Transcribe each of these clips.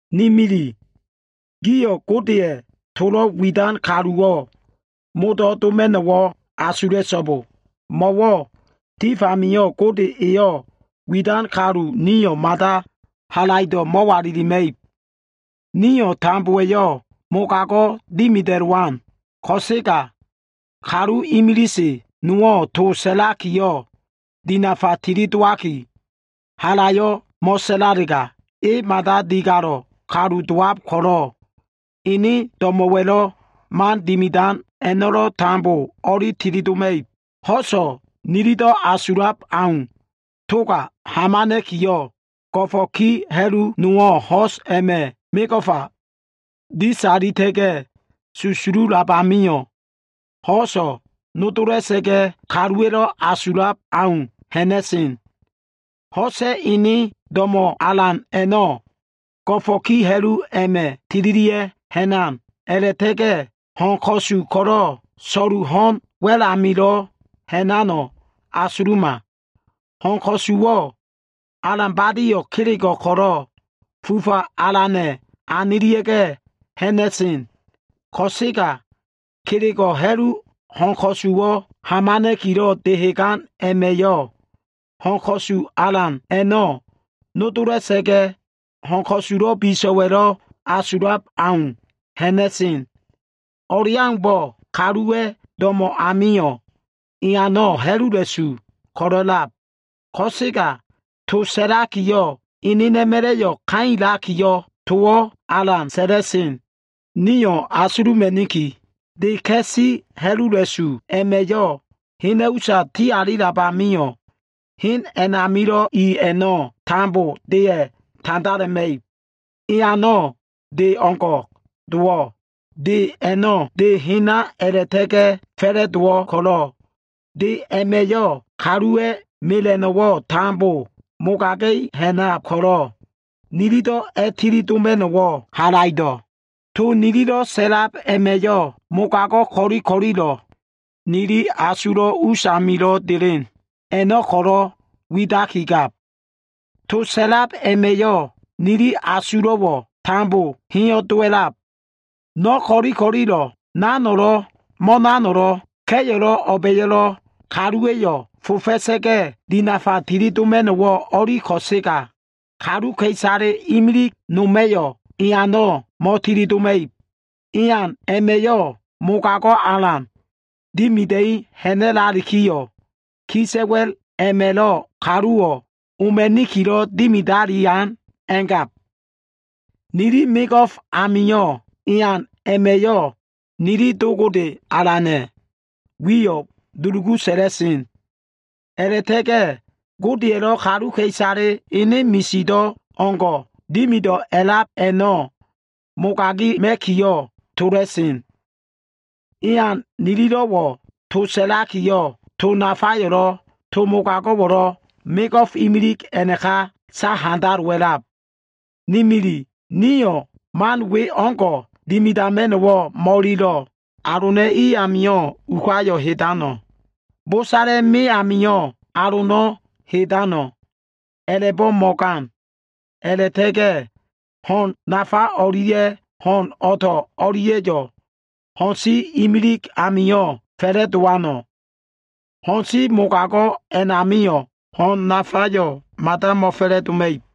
Ni mili gio꞉, Godeya꞉ tolo꞉ widan kaluwo꞉ modo꞉ doma꞉no꞉wo꞉ asula꞉so꞉bo. Mo꞉wo꞉ tif amio꞉ Gode eyo꞉ widan kalu nio꞉ mada halaido꞉ mo꞉walilima꞉ib. Nio꞉ tambowa꞉yo꞉ mogago꞉wo꞉ dimida꞉lowan. Ko꞉sega, kalu imilise nowo꞉ to sa꞉lakiyo꞉ dinafa tilidowaki, halayo꞉ mo꞉sa꞉lalega, e mada digalo꞉ kalu dowab ko꞉lo꞉, ene do꞉mo꞉wa꞉lo꞉ man dimidan a꞉no꞉lo꞉ tambo o꞉li tilidoma꞉ib. Ho꞉so꞉ nilido꞉ asulab au toga hamana꞉kiyo꞉, go꞉fo꞉ ki ha꞉lu nowo꞉ ho꞉s a꞉ma꞉ mego꞉fa disalita꞉ga꞉, susululab amio꞉, ho꞉so꞉ nodola꞉sa꞉ga꞉, kaluwa꞉lo꞉ asulab au ha꞉na꞉sen. Ho꞉sa꞉ ene do꞉mo꞉ alan a꞉no꞉ ko꞉lo꞉ go꞉fo꞉ ki ha꞉lu a꞉ma꞉ tililia꞉ ha꞉nan. A꞉la꞉ta꞉ga꞉ ho꞉n ko꞉su ko꞉lo꞉ so꞉lu ho꞉n wa꞉l amilo꞉ ha꞉nano꞉ asuluma. Ho꞉n ko꞉suwo꞉ alan badio꞉ kelego꞉ ko꞉lo꞉ fufa alana꞉ anilia꞉ga꞉ ha꞉na꞉sen. Ko꞉sega kelego꞉ ha꞉lu, ho꞉n ko꞉suwo꞉ hamana꞉kilo꞉ dehegan a꞉ma꞉yo꞉ ho꞉n ko꞉su alan a꞉no꞉ nodola꞉sa꞉ga꞉, ho꞉n ko꞉sulo꞉ biso꞉wa꞉lo꞉ asulab au ha꞉na꞉sen. O꞉leaumbo꞉, kaluwa꞉ do꞉mo꞉ amio꞉, eano꞉ ha꞉lula꞉su ko꞉lo꞉lab, ko꞉sega to sa꞉lakiyo꞉, enena꞉ma꞉la꞉yo꞉ kailakiyo꞉, towo꞉ alan sa꞉la꞉sen. Nio꞉ asuluma꞉niki. De ka꞉si ha꞉lula꞉su a꞉ma꞉yo꞉ hena꞉ usa ti alilab amio꞉, hen a꞉namilo꞉ i a꞉no꞉ tambo deya꞉ tandalema꞉ib. Eano꞉ de o꞉ngo꞉ dowo꞉. De a꞉no꞉ de hena a꞉la꞉ta꞉ga꞉ fa꞉la꞉dowo꞉ ko꞉lo꞉, de a꞉ma꞉yo꞉ kaluwa꞉ mela꞉no꞉wo꞉ tambo mogaga꞉i ha꞉nab ko꞉lo꞉, nililo꞉ a꞉ tilidoma꞉no꞉wo꞉ halaido꞉. To nililo꞉ sa꞉lab a꞉ma꞉yo꞉, mogago꞉ ko꞉li ko꞉lilo꞉ nili asulo꞉ us amilo꞉ delen a꞉no꞉ ko꞉lo꞉ widakigab. To sa꞉lab a꞉ma꞉yo꞉ nili asulo꞉wo꞉ tambo heyo꞉ dowa꞉lab. No꞉ ko꞉li ko꞉lilo꞉wo꞉, ka꞉yo꞉lo꞉, o꞉ba꞉yo꞉lo꞉, kaluwa꞉yo꞉ fofakiyo꞉ dinafa tilidoma꞉no꞉wo꞉ o꞉li ko꞉sega, kaluka꞉isale imilig noma꞉yo꞉ eano꞉ mo꞉tilidoma꞉ib. Ean a꞉ma꞉yo꞉ mogago꞉ alan dimida꞉i ha꞉na꞉lalikiyo꞉, kisa꞉wa꞉l a꞉ma꞉lo꞉ kaluwo꞉ oma꞉nikilo꞉ dimidalian a꞉ngab. Nili mego꞉f amio꞉ ean a꞉ma꞉yo꞉ nili Do Gode Alana꞉ wiyo꞉ dulugu sa꞉la꞉sen. A꞉la꞉ta꞉ga꞉ Godeya꞉lo꞉ kaluka꞉isale ene misido꞉ o꞉ngo꞉ dimido꞉ a꞉lab a꞉no꞉ mogagima꞉kiyo꞉ tola꞉sen. Ean nililo꞉wo꞉ to sa꞉lakiyo꞉, to nafayo꞉lo꞉, to mogago꞉wo꞉lo꞉, mego꞉f imilig a꞉naka sahandalowa꞉lab. Ni mili, nio꞉ man we o꞉ngo꞉ dimidama꞉no꞉wo꞉ mo꞉ililo꞉. Alona꞉ i amio꞉ ukayo꞉ hedano꞉? Bosala꞉ me amio꞉ alono꞉ hedano꞉? A꞉la꞉bo꞉ mo꞉gan. Ni mili, ho꞉n nafa o꞉lia꞉ ho꞉n o꞉to꞉ o꞉lia꞉yo꞉, ho꞉n si imilig amio꞉ fa꞉la꞉dowano꞉? Ho꞉n si mogago꞉ a꞉namio꞉, ho꞉n nafayo꞉ mada mo꞉fa꞉la꞉doma꞉ib.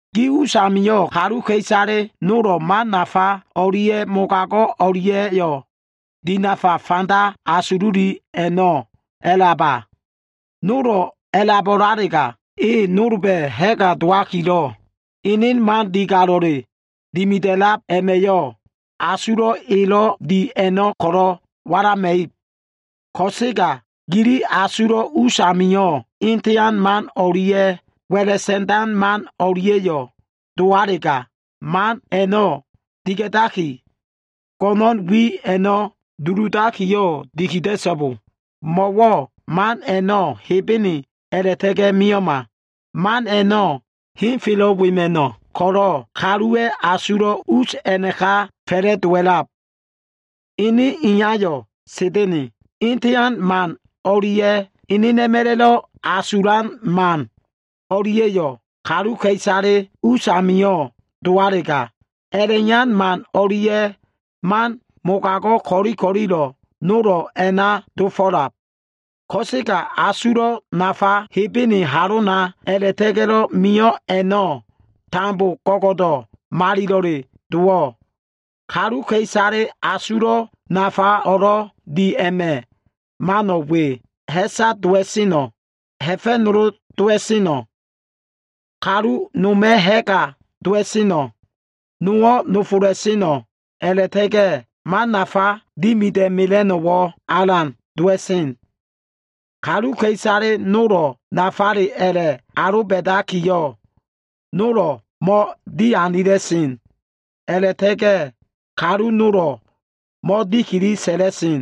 Gi usamio꞉ kaluka꞉isale nolo꞉ man nafa o꞉lia꞉ mogago꞉ o꞉lia꞉yo꞉ dinafa fanda asululi a꞉no꞉ a꞉laba? Nolo꞉ a꞉labo꞉lalega, e nolba꞉ ha꞉ga dowakilo꞉, ene man digalo꞉le dimida꞉lab a꞉ma꞉yo꞉, asulo꞉ elo꞉ di a꞉no꞉ ko꞉lo꞉ walama꞉ib. Ko꞉sega gili asulo꞉ usamio꞉ etean man o꞉lia꞉ wa꞉la sa꞉ndan man o꞉lia꞉yo꞉ dowalega, man a꞉no꞉ diga꞉daki, go꞉no꞉n wi a꞉no꞉ duludakiyo꞉ dikida꞉so꞉bo. Mo꞉wo꞉ man a꞉no꞉ Hebene a꞉la꞉ta꞉ga꞉ mio꞉ma. Man a꞉no꞉ henfelo꞉ wema꞉no꞉ ko꞉lo꞉, kaluwa꞉ asulo꞉ us a꞉naka fa꞉la꞉dowa꞉lab. Ene iyayo꞉ Sa꞉da꞉na꞉. Etean man o꞉lia꞉ enena꞉ma꞉la꞉lo꞉ asulan man o꞉lia꞉yo꞉ kaluka꞉isale us amio꞉ dowalega, a꞉la꞉iyan man o꞉lia꞉ man mogago꞉ ko꞉li ko꞉lilo꞉ nolo꞉ a꞉na dofo꞉lab. Ko꞉sega asulo꞉ nafa ko꞉lo꞉ Hebene halona a꞉la꞉ta꞉ga꞉lo꞉ mio꞉ a꞉no꞉ tambo go꞉go꞉do꞉ malilo꞉le dowo꞉. Kaluka꞉isale asulo꞉ nafa o꞉lo꞉ di a꞉ma꞉ mano꞉ we. Ha꞉sa dowa꞉sen, ha꞉fa꞉nolo dowa꞉sen, kalu noma꞉ ha꞉ga dowa꞉sen, nowo꞉ nofola꞉sen, a꞉la꞉ta꞉ga꞉ man nafa dimida꞉mela꞉no꞉wo꞉ alan dowa꞉sen. Kaluka꞉isale nolo꞉ nafale a꞉la꞉ aloba꞉dakiyo꞉, nolo꞉ mo꞉dianila꞉sen. A꞉la꞉ta꞉ga꞉ kalu nolo꞉ mo꞉dikili sa꞉la꞉sen.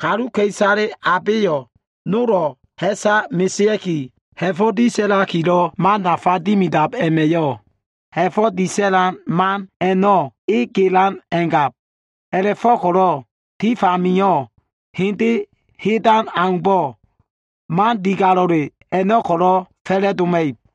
Kaluka꞉isale abeyo꞉ nolo꞉ ha꞉sa mesea꞉ki, ha꞉fo꞉ disa꞉lakilo꞉ man nafa dimidab a꞉ma꞉yo꞉ ha꞉fo꞉ disa꞉lan man a꞉no꞉ e gelan a꞉ngab. A꞉la꞉fo꞉ko꞉lo꞉ tif amio꞉ hende hedan aumbo꞉, man digalo꞉le a꞉no꞉ ko꞉lo꞉ fa꞉la꞉doma꞉ib.